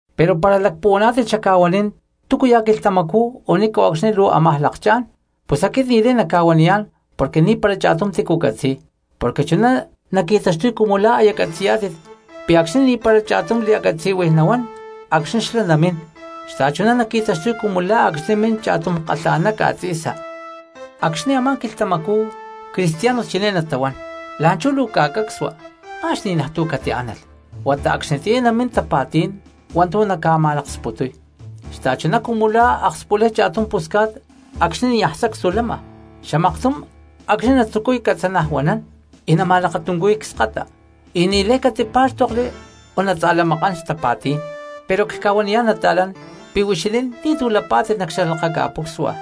Pero para lacpuhuaná̠tit xacca̠huanín túcuya̠ quilhtamacú o ni̠nco̠cxni luu ámaj lakchá̠n, pus aquit ni̠lay nacca̠huaniyá̠n porque ni̠para cha̠tum tícu catzi̠y. Porque chuná naqui̠taxtuy cumu la̠ aya catzi̠yá̠tit pi̠ acxni̠ ni̠para cha̠tum li̠a̠catzi̠huij nahuán acxni̠ xlá namín, xta̠chuná naqui̠taxtuy cumu la̠ acxni̠ min cha̠tum kalha̠ná ca̠tzi̠sa. Acxni̠ a̠má quilhtamacú cristianos chiné natahuán: “La̠nchú luu ca̠cacsua ma̠x ni̠najtu̠ catiánalh”, huata acxnitiyá namín tapa̠tí̠n hua̠ntu̠ naca̠ma̠laksputuy, xta̠chuná cumu la̠ akspulay cha̠tum pusca̠t acxni̠ niaj sacstu lama, xamaktum acxni̠ natzucuy catzanajuanán y nama̠lakatuncuhuiy cskata, y ni̠lay catipá̠xtokli o natza̠lamakán xtapa̠tí̠n. Pero cca̠huaniyá̠n nata̠lán, pi̠ huixinín ni̠tu̠ lapá̠tit nac xalakaca̠pucsua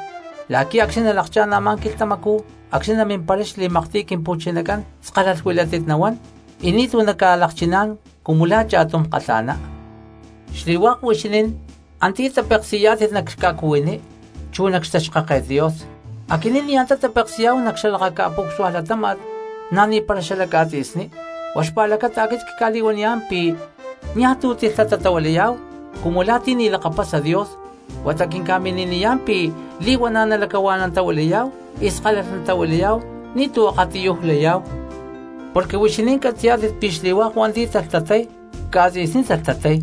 la̠qui̠ acxni̠ nalakchá̠n a̠má quilhtamacú acxni̠ namimparay xli̠maktiy Quimpu̠chinacán skalalh huilátit nahuán y ni̠tu̠ naca̠lakchiná̠n cumu la̠ cha̠tum kalha̠ná. Xli̠hua̠k huixinín antiyá tapeksi̠yá̠tit nac ca̠cuhuiní chu nac xtaxkáket Dios, aquinín ni̠ antá tapeksi̠yá̠hu nac xalakaca̠púcsua latáma̠t na̠ ni̠para xalac ca̠tzi̠sní. Huá xpa̠lacata aquit cca̠li̠huaniyá̠n pi̠ niaj tu̠ tilhtatatahuilayá̠hu cumu la̠ ti̠ ni̠ talakapasa Dios, huata quinca̠mini̠niyá̠n pi̠ li̠huana̠ nalacahua̠nantahuilayá̠hu y skalalh natahuilayá̠hu, ni̠tu̠ akatiyuj layá̠hu. Porque huixinín catzi̠yá̠tit pi̠ xli̠hua̠k hua̠nti̠ talhtatay, ca̠tzi̠sní talhtatay,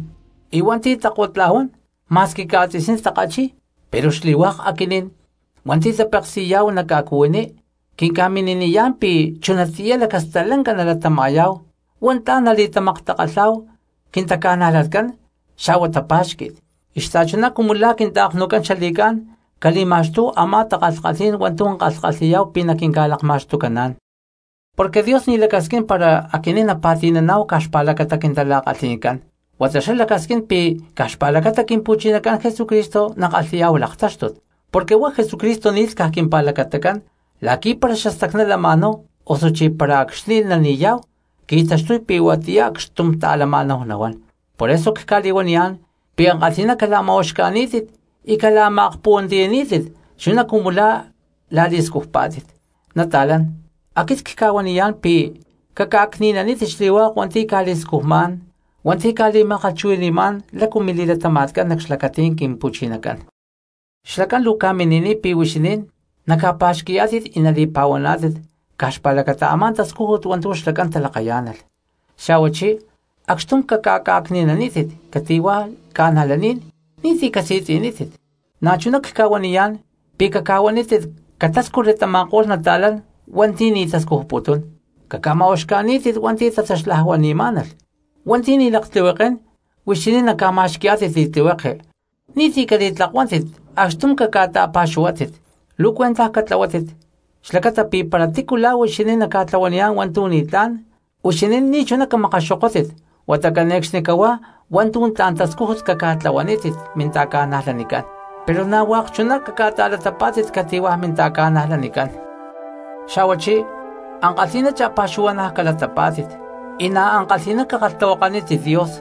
y hua̠nti̠ takottla̠huán ma̠squi ca̠tzi̠sní takachi̠y. Pero xli̠hua̠k aquinín hua̠nti̠ tapeksi̠yá̠hu nac ca̠cuhuiní quinca̠mini̠niyá̠n pi̠ chunatiyá lacastalanca nalatama̠yá̠hu. Huá tla̠n nali̠tamaktakalhá̠hu quintaca̠najlatcán xa̠hua tapa̠xqui̠t, y xta̠chuná cumu la̠ quinta̠knucán xali̠cá̠n cali̠ma̠xtúhu a̠má takalhkalhí̠n hua̠ntu̠ kalhi̠yá̠hu pi̠ naquinca̠lakma̠xtucaná̠n. Porque Dios ni̠chuná lacasquín para aquinín napa̠ti̠naná̠hu caj xpa̠lacata quintala̠kalhi̠ncán, huata xlá lacasquín pi̠ caj xpa̠lacata Quimpu̠chinacán Jesucristo nakalhi̠yá̠hu laktáxtut. Porque huá Jesucristo ni̠lh caj quimpa̠lacatacán la̠qui̠ para xastacná lama̠náhu osuchí para acxni̠ nani̠yá̠hu qui̠taxtuy pi̠ huatiyá acxtum ta̠lama̠náhu nahuán. Por eso cca̠li̠huaniyá̠n pi̠ ankalhi̠ná cala̠ma̠uxca̠ní̠tit y cala̠ma̠kpuhuantiyaní̠tit chuná cumu la̠ la̠li̠scujpá̠tit. Nata̠lán, aquit cca̠huaniyá̠n pi̠ caca̠cni̠nanítit xli̠hua̠k hua̠nti̠ ca̠li̠scujmá̠n hua̠nti̠ ca̠li̠ma̠kalhchuhui̠ni̠má̠n lácu mili̠latama̠tcán nac xlacatí̠n Quimpu̠chinacán. Xlacán luu ca̠mini̠niy pi̠ huixinín naca̠pa̠xqui̠yá̠tit y nali̠pa̠huaná̠tit caj xpa̠lacata a̠má tascújut hua̠ntu̠ xlacán talakayá̠nalh. Xa̠huachí acxtum caca̠cni̠nanítit cati̠hua̠ cristianos ni̠ti̠ casi̠tzi̠nítit. Na̠chuná cca̠huaniyá̠n pi̠ cahuanítit catáscujli tama̠ko̠lh nata̠lán hua̠nti̠ ni̠ tascujputún, caca̠ma̠uxca̠ní̠tit hua̠nti̠ tataxlajuani̠má̠nalh, hua̠nti̠ ni̠ laktlihuekén huixinín naca̠ma̠xqui̠yá̠tit li̠tlihueke, xa̠huachí ni̠ti̠ cali̠tlakuántit acxtum caca̠ta̠pa̠xuhuátit. Luu cuentaj catlahuátit xlacata pi̠ para tícu la̠ huixinín naca̠tlahuaniyá̠n hua̠ntu̠ ni̠tlá̠n, huixinín ni̠chuná camakaxokótit huata cane̠cxnicahuá hua̠ntu̠ tla̠n tascújut caca̠tlahuanítit minta̠ca̠najlanicán, pero na̠ hua̠k chuná caca̠ta̠latapá̠tit cati̠hua̠ cristianos. Xa̠huachí ankalhi̠ná cha̠pa̠xuhua̠na̠ calatapá̠tit, y na̠ ankalhi̠ná cakalhtahuakanítit Dios.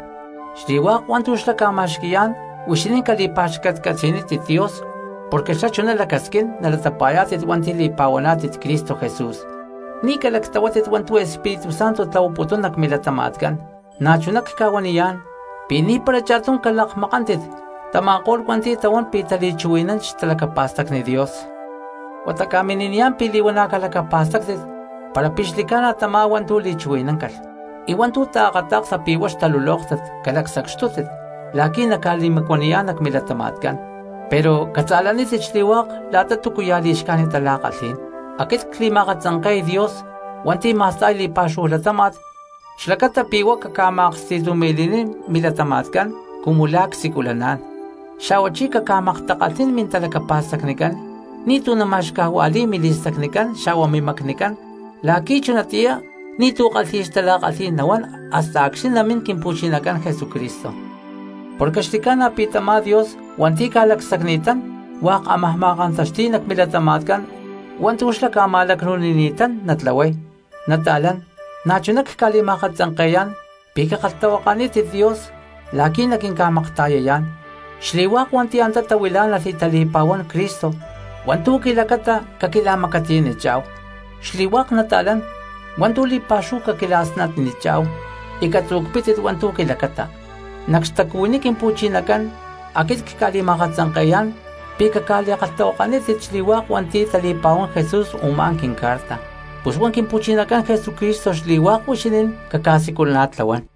Xli̠hua̠k hua̠ntu̠ xlá ca̠ma̠xqui̠yá̠n huixinín cali̠pa̠xcatcatzi̠nítit Dios, porque xlá chuná lacasquín nalatapa̠yá̠tit hua̠nti̠ li̠pa̠huaná̠tit Cristo Jesús. Ni̠ calactlahuátit hua̠ntu̠ Espíritu Santo tlahuaputún nac milatama̠tcán. Na̠chuná cca̠huaniyá̠n pi̠ ni̠para cha̠tum caca̠lakmakántit tama̠ko̠lh hua̠nti̠ tahuán pi̠ tali̠chuhui̠nán xtalacapa̠stacni Dios. Huata ca̠mini̠niyá̠n pi̠ li̠huana̠ calacapa̠stáctit para pi̠ xli̠ca̠na tamá hua̠ntu̠ li̠chuhui̠náncalh, y hua̠ntu̠ taakata̠ksa pi̠ huá xtalulóktat calacsacxtútit la̠qui̠ naca̠li̠macuaniyá̠n nac milatama̠tcán. Pero catza̠lanítit xli̠hua̠k la̠ta túcuya̠ li̠xcájnit tala̠kalhí̠n. Aquit cli̠ma̠akatzanke̠y Dios hua̠nti̠ ma̠sta̠y li̠pa̠xúhu latáma̠t xlacata pi̠ huá caca̠ma̠ksti̠tumi̠li̠nín milatama̠tcán cumu la̠ csiculaná̠n; xa̠huachí caca̠maktakalhnín mintalacapa̠stacnicán, ni̠tu̠ nama̠xcajua̠li̠y mili̠stacnicán xa̠hua mimacnicán la̠qui̠ chunatiyá ni̠tu̠ kalhi̠y xtala̠kalhí̠n nahuán hasta acxni̠ namín Quimpu̠chinacán Jesucristo. Porque xli̠ca̠na pi̠ tamá Dios hua̠nti̠ ca̠lacsacni̠tán hua̠k ámaj ma̠kantaxti̠y nac milatama̠tcán hua̠ntu̠ xlá ca̠ma̠lacnu̠nini̠tán natlahuay. Nata̠lán, na̠chuná cca̠li̠ma̠akatzanke̠yá̠n pi̠ cakalhtahuakanítit Dios la̠qui̠ naquinca̠makta̠yayá̠n. Xli̠hua̠k hua̠nti̠ antá tahuilá̠nalh y tali̠pa̠huán Cristo hua̠ntu̠ quilacata caquila̠macatiyanichá̠hu, xli̠hua̠k nata̠lán hua̠ntu̠ li̠pa̠xúhu caquila̠snatnichá̠hu y caca̠tzu̠cpítit hua̠ntu̠ quilacata. Nac xtacuhuiní Quimpu̠chinacán aquit cca̠li̠ma̠peksi̠yá̠n pi̠ caca̠li̠kalhtahuakanítit xli̠hua̠k hua̠nti̠ tali̠pa̠huán Jesús u̠má quincarta. Pus huá Quimpu̠chinacán Jesucristo xli̠hua̠k huixinín caca̠siculana̠tlahuán.